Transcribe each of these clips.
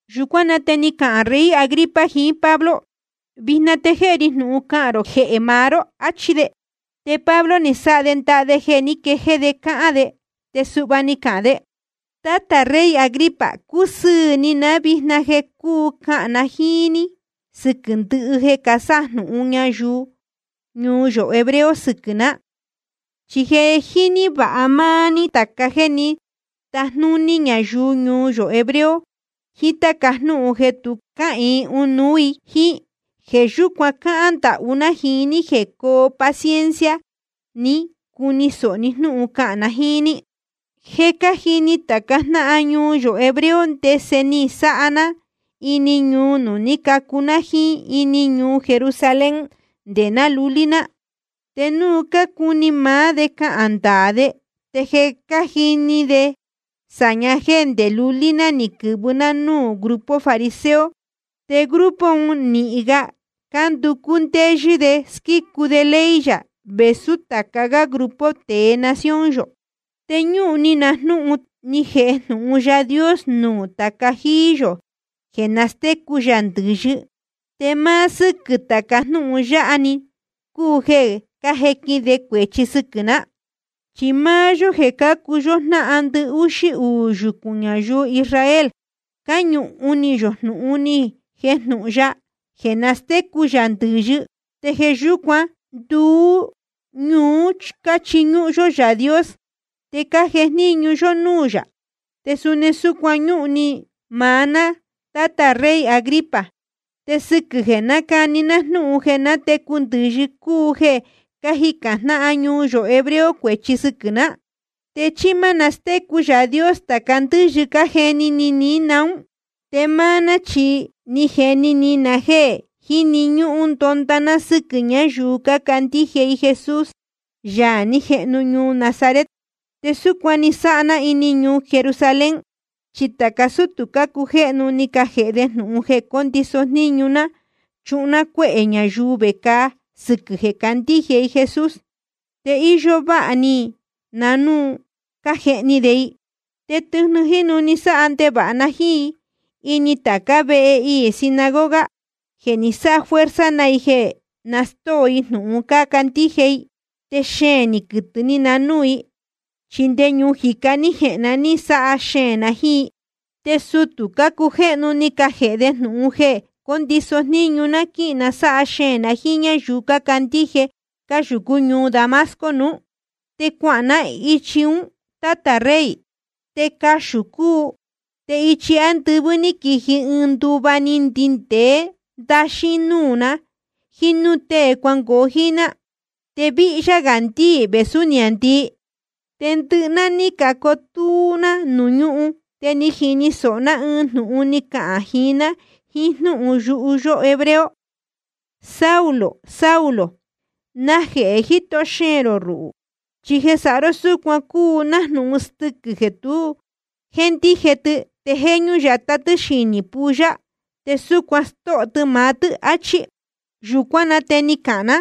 Yūcuán na te ni cahān rey Agripa jiín Pablo: Vijna te jéhe ri jnūhun cahān rō jehē maá ró, achí de. Te Pablo ni sáha de ndaha de jeē ní quejéé de cáhán de, te suhva ni cahān de: Tátā rey Agripa, cúsɨɨ̄ ni ná vijna jeē cúu cahān na jíín ní sɨquɨ̄ ndɨhɨ jeē casájnúhún ñáyuu ñuu yō hebreo sɨquɨ̄ ná. Chi je jíní vāha máá ní tāca jéē ní tajnúní ñayuu ñuu yō hebreo jiín táca jnúhun jeē tu cáhīin ɨnuú i jíín. Jeē yúcuan cáhán ndahú ná jiín ní jeē coo paciencia ni cuni sōho ní jnúhun cahān na jíín ní. ’Je cájini tāca jnáhan ñuu yō hebreo ndese ni sáha ná ini ñuu nuū ní cacu ná jíín ini ñuu Jerusalén nde ná lulí ná. Te núu cácuni maá de cahān ndaā de, te je cájini de sāña jéē ndé lulí ná ni quɨ̄vɨ ná nuū grupo fariseo, te grupo un nīhin ga cánducú ndéyɨ́ de squícu de ley yā vēsú tāca gá grupo tēe nación yō. Te ñúhun ni na jnúhun ni jejnūhun Yaā Dios nuū tāca jíí yō jeē nastécu yā ndɨ̄yɨ, te máá sɨ́quɨ̄ tāca jnúhun yáha‑ni cúu jeē cájequin de cuēchi sɨquɨ̄ ná. Chi máá yó jeē cácuu yó jnáhan ndɨhúxí uū yucūn ñayuu Israel, cáñūhun ni yō jnūhun ni jejnūhun ya jeē nastécu yā ndɨ̄yɨ, te jeē yúcuan nduú ñuú cáchiñúhún yó Yaā Dios te cájejníñu yó núū yā. Te suni súcuan ñúhun ni maá ná, tátā rey Agripa, te sɨquɨ̄ jeē nácani ná jnúhun jeē natecu ndɨ̄yɨ cúu jeē cájicān jnáhan ñuu yō hebreo cuēchi sɨquɨ̄ ná. ¿Te chí má nastécu Yaā Dios tāca ndɨ́yɨ cájeni ni ní naún? ’Te máá ná chi ni jeni ni na jéē jíni ñúhún ndonda ná sɨ́quɨ̄ ñayuu cácandíje i Jesús, Yaā ní jehnu ñuu Nazaret. Te súcuan ni sáha ná ini ñuu Jerusalén, chi tāca sútū cácujéhnu ni cajēhe de jnūhun jeē cóndiso jníñu ná chuhun ná cuéhē ñayuu vecāa sɨquɨ̄ jeē cácandíje i Jesús, te íyó váha ni na núu cájehni de i. Te tɨjnɨ jínu ni sáha ndevāha na jíín i ini tācá vehe iī sinagoga jeē ni sáha fuerza na i jeē na stóo i jnūhun cácandíje i. Te xeēn ni quɨtɨ̄ ni na núū i, chi nde ñuu jicá ní jehēn ná ni sáha xeēn na jíín i. ’Te sutū cácujéhnu ni cajēhe de jnūhun jeē cóndiso jníñu ná quíhīn na sáha xeēn na jíín ñáyuu cácandíje cáyūcú ñuu Damasco nuú. Te cuahān ná ichi ún, tátā rey, te caxū cúu, te ichi ándɨvɨ́ ní quiji ɨɨn nduva ni ndindēé ndaxín núū na jíín núū tée cuangoo jíín ná, te víhyá gā ndíī vēsú niāndii. Te ndɨhɨ ná ní cacotúú ná nuū ñúhun. Te ni jini sōho ná ɨɨn jnūhun ni cahān jiín ná jiín jnúhun yuhu yó hebreo: Saulo, Saulo, ¿najehē jíto xeēn rō ruhū? Chi jeē sáha ró súcuan cúu nájnūhun stɨquɨ̄ jeē tu jéndije tɨ, te jéñú yatá tɨ́ xinī pulla, te súcuan stóho tɨ maá tɨ́, áchí. Yūcuán na te ni cahān ná: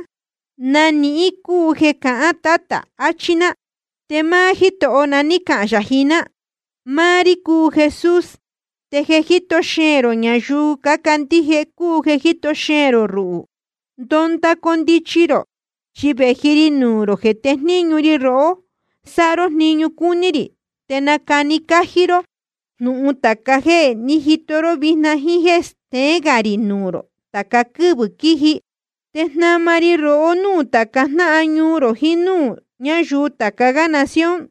¿Na nihín cúu jeē cahán, Tátā? achí ná. Te máá Jítoho na ní cahān yā jiín ná: Máá rí cúu Jesús, te jeē jíto xeēn rō ñayuu cácandíje i ruhū cúu jeē jíto xeēn rō ruhū. Ndonda condichi rō, chi vēji ri nuū rō jeē tejníñu ri rohó sáha ró jniñu cúní rī, te nacani cájí ró jnūhun tāca jéē ní jito ró vijna, jíín jéē steén gā rī nuū rō tāca quɨ́vɨ̄ quíji. Te jnama ri rohó núū tāca jnáhan ñuu rō jiín núū ñáyuu tāca gá nación,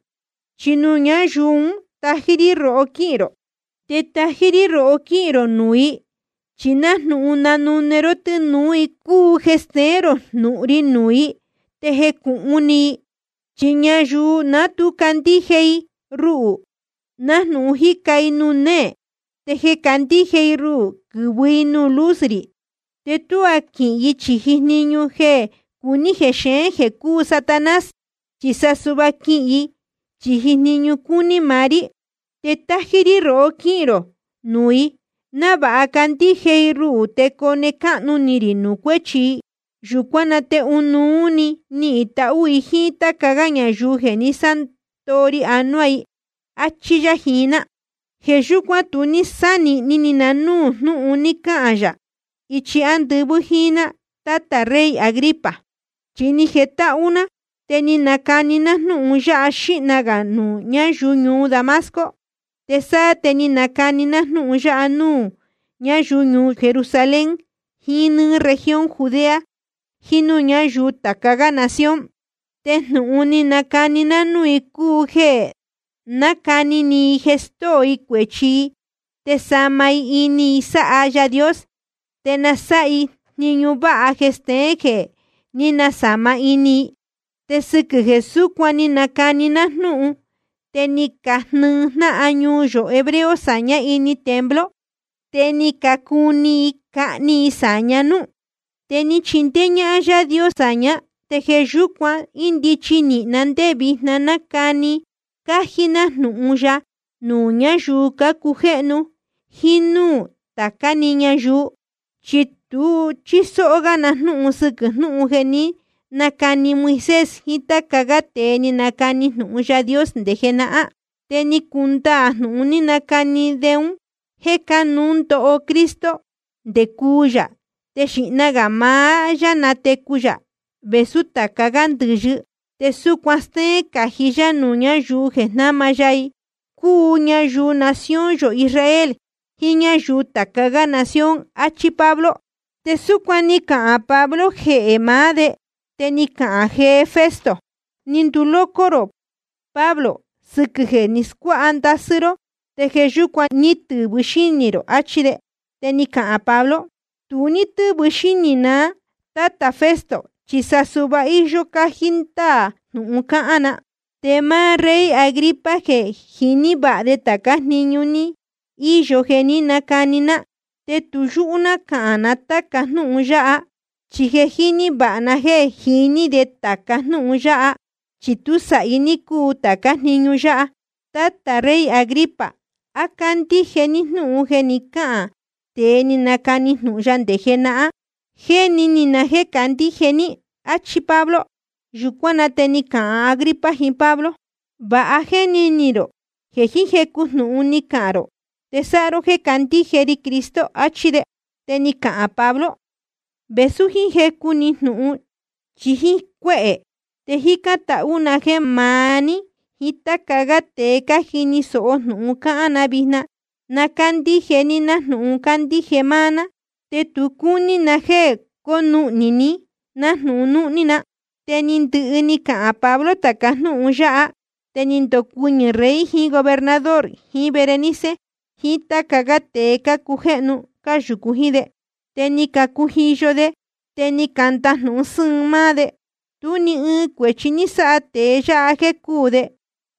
chi nuū ñáyuu un tájí rí rohó quíhīn rō. Te tájí rí rohó quíhīn rō nuū i, chi nájnūhun nanune ró tɨ́nūú i cúu jeē steén rō jnūhun ri nuū i te jecūhun ni i. Chi ñayuu ná tu candíje i ruhū, nájnūhun cájica i nuū néē. Te jeē candíje i ruhū, quɨ̄vɨ i nuū luz rī, te tuá quɨhɨ i chīji jniñu jeē cuní jexeén jeē cúu Satanás, chi sa suhva quɨhɨ i chīji jniñu cúní maá rí. Te tájí rí rohó quíhīn rō nuū i, návāha candíje i ruhū te cone cáhnu ni rī nuū cuéchi i. Yūcuán na te ɨnuú níhīn tahú i jíín táca gá ñayuu jeē ni sándoo ri anuá i, áchí yá jiín ná. ’Jeē yúcuan tu ní sánīhni ni na núū jnúhun ni cahān yā ichi ándɨvɨ́ jíín ná, tátā rey Agripa. Chi ni jetáhú ná, te ni nacani ná jnúhun ya xīhna gā nuū ñáyuu ñuu Damasco, te sáá te ni nacani ná jnúhun ya nuū ñáyuu ñuu Jerusalén jiín nɨ́ɨ́ región Judea jiín núū ñáyuu tāca gá nación. Te jnūhun ni nacani ná núū i cúu jeē na nácani ni i jeē stóo i cuēchi i te nasāma ini i sáha Yaā Dios, te na sáha i jniñu váha jeē steén jeē ní nasāma ini i. Te sɨquɨ̄ jeē súcuan ni nacani ná jnúhun te ni cajnɨɨ jnáhan ñuu yō hebreo sāñá ini templo, te ni cacuni i cahni i sāña núú. Te ni chindéé ñáhán Yáā Dios sāñá, te jeē yúcuan índichi nīhin na ndé vijna nácani cájí ná jnūhun ya nuū ñáyuu cácujéhnu jíín núū tācá‑ni ñayuu. Chi tu chísó gá na jnúhun sɨquɨ̄ jnúhun jeē ní nacani Moisés jiín táca gá tēe ni canacani jnūhun Yaā Dios nde jenahán. Te ni cundaā jnūhun ni canacani de un jéē cánuú ndoho Cristo nde cuu yā, te xīhna gā maá yá natecu vēsú tāca gá ndɨ̄yɨ, te súcuan stéén cají yá nuū ñáyuu jeē jnáma ya i, cúu ñayuu nación yō Israel jiín ñáyuu tāca gá nación, áchí Pablo. Te súcuan ni cahān Pablo jehē maá de, te ni cahān jee Festo: Ni nduloco rō, Pablo. Sɨquɨ̄ jeē ni scuáha ndasɨ́ ró te jeē yúcuan ní tɨ̄vɨ xínī rō, áchí de. Te ni cahān Pablo: Tu ní tɨ́vɨ xínī na, tátā Festo, chi sa suhva íyó cájí ndáā jnūhun cáhán na. Te máá rey Agripa je jíní vāha de tācá jniñu ní íyo jeē ní nacani ná, te tu yúhú ná cahān na táca jnúhun yáha, chi je jíní vāha na jéē jiní de tāca jnúhun yáha, chi tú sāhi ní cúu tācá jniñu yáha. Tátā rey Agripa, ¿á cándíje ní jnúhun jeē ní cacahān tēe ni canacani jnūhun ya nde jenahán? Jéni ni na jéē candíje ní, áchí Pablo. Yūcuán na te ni cahān Agripa jiín Pablo: Va jéni ni rō jeē jiín jecu jnūhun ni cahān rō te sáha ró jeē candíje ri Cristo, achí de. Te ni cahān Pablo: Vēsú jiín jecu‑ni jnūhun chí jíín cuéhē, te jícán tahú na jéē maá ní jíín táca gá tēe cájini sōho jnūhun cáhán na vijna, na cándíje ní nájnūhun cándíje máá ná, te tu cúní na jéē cónuhnī ni nájnūhun núhní na. Te ni ndɨhɨ ni cahān Pablo tāca jnúhun yáha. Te ni ndocuɨñɨ̄ rey jiín gobernador jiín Berenice jiín táca gá tēe cácujéhnu cáyūcu jíín de. Te ni cacujiyo de, te ni candajnūhun sɨ́ɨn máá de: Tú ni ɨɨn cuēchi ní sáha tēe yáha jéē cúū de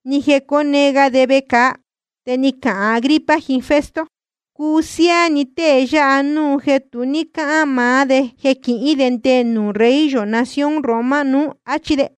ni jeē cóne ga de vecāa. Te ni cahān Agripa jiín Festo: Cuu siáá ni tée yáha núu jeē tu ní cáhán maá de jeē quihín de nde nuū rey yō nación Roma nuú, áchí de.